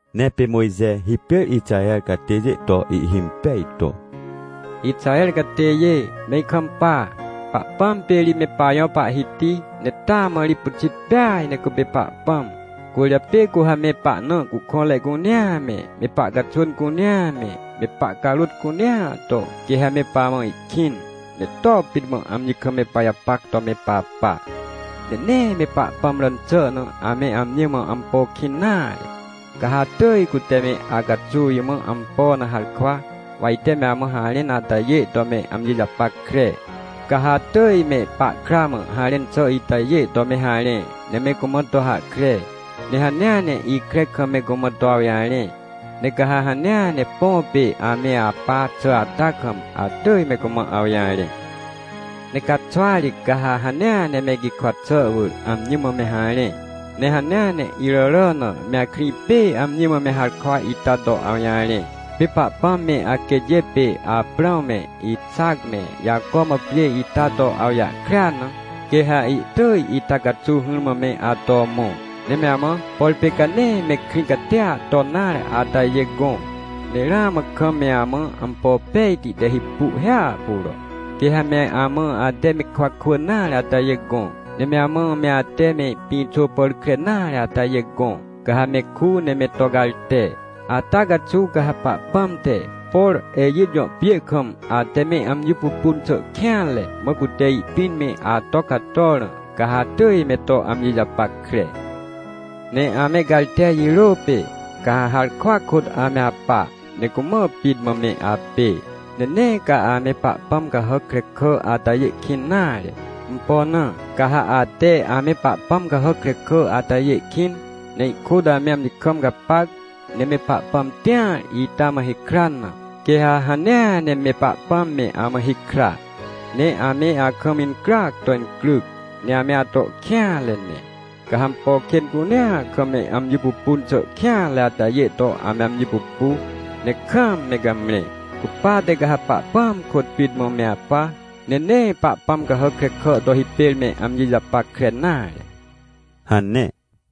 Ne pê Mojxe hipêr Ixaher catêjê to ihhimpej to: — Ixaher catêjê, me ikampa, Pahpãm pê ri me pajõ Pahhiti, ne taa mã ri pyxitpeaj ne cupê Pahpãm. Cwỳrjapê cu ha me pahna cuhkõnrecunea me, me pahcaxwỳn cunea me, me pahcarôt cunea to, quê ha mepamã ihkĩn, ne to pit mã amji kam me pajapac to me papa. Ne nee me Pahpãm ràn xà na, ame amji mã ampo kĩnnare. Ca ha atỳj, cute me acaxuw imã ampo na harkwa, wa ite me amãharẽn atajê to me amji japackre. Ca ha atỳj me pahkra mã harẽn xà itajê to me harẽ, ne me cumã to hahkre, ne hanea ne ikre kam me cumã toawjarẽ, ne ca ha hanea ne põ pê ame apaxà ata kam, atỳj me cumã awjarẽ. Ne caxwa ri ca ha hanea ne me gikwa xà wỳr amjimã me harẽ, ne hanea ne iràrà na me akrĩ pê amji mã me harkwa ita to awjarẽ. — Pê Pahpãm me aquêtjê pê Aprãw me, Ixac me, Jaco mã pjê ita toawjahkrea na, quê ha ihtỳjita caxuw hỹrmã me ato mõ. Ne me amã, por pê canee me krĩ catia ton nare atajê gõ, ne ramãkam me amã ampo pejti te hipu hiahpuro. Quê ha meamã ate me kwa kwỳn nare atajê gõ, ne me amã me ate me pĩxô pàr krenare atajê gõ, ca ha me ku ne me togarte. Ata caxuw ca ha Pahpãm te, por Ejit jõpjê kam ateme amji pupun xà kêanre, mã cute ihpĩn me ato cator na, ca ha atỳj me to amji japackre. — Ne ame garte jirô pê, ca ha harkwa kôt ame apa, ne cumã pit mã me apê. Ne nee ca ame pahpãm cahàckrekà atajê kĩn nare. Ampo na? Ca ha ate amepahpãm cahàc krekà atajê kĩn, ne ihkôt ame amji kam gapac, ne me Pahpãm tĩar ita mãhikran na, quê ha hanea ne me Pahpãm me amã hikra. Ne ame akam incryac toincryc, ne ame ato kêanre ne. Ca ha ampo kên cunea kam me amji pupun xàkêanre atajê to ame amji pupu, ne kaam me gamre. Cupate ca ha Pahpãam kôt pit mã me apa, nenee pahpãm cahàc krekà to hipêr me amji japackre nare — hane.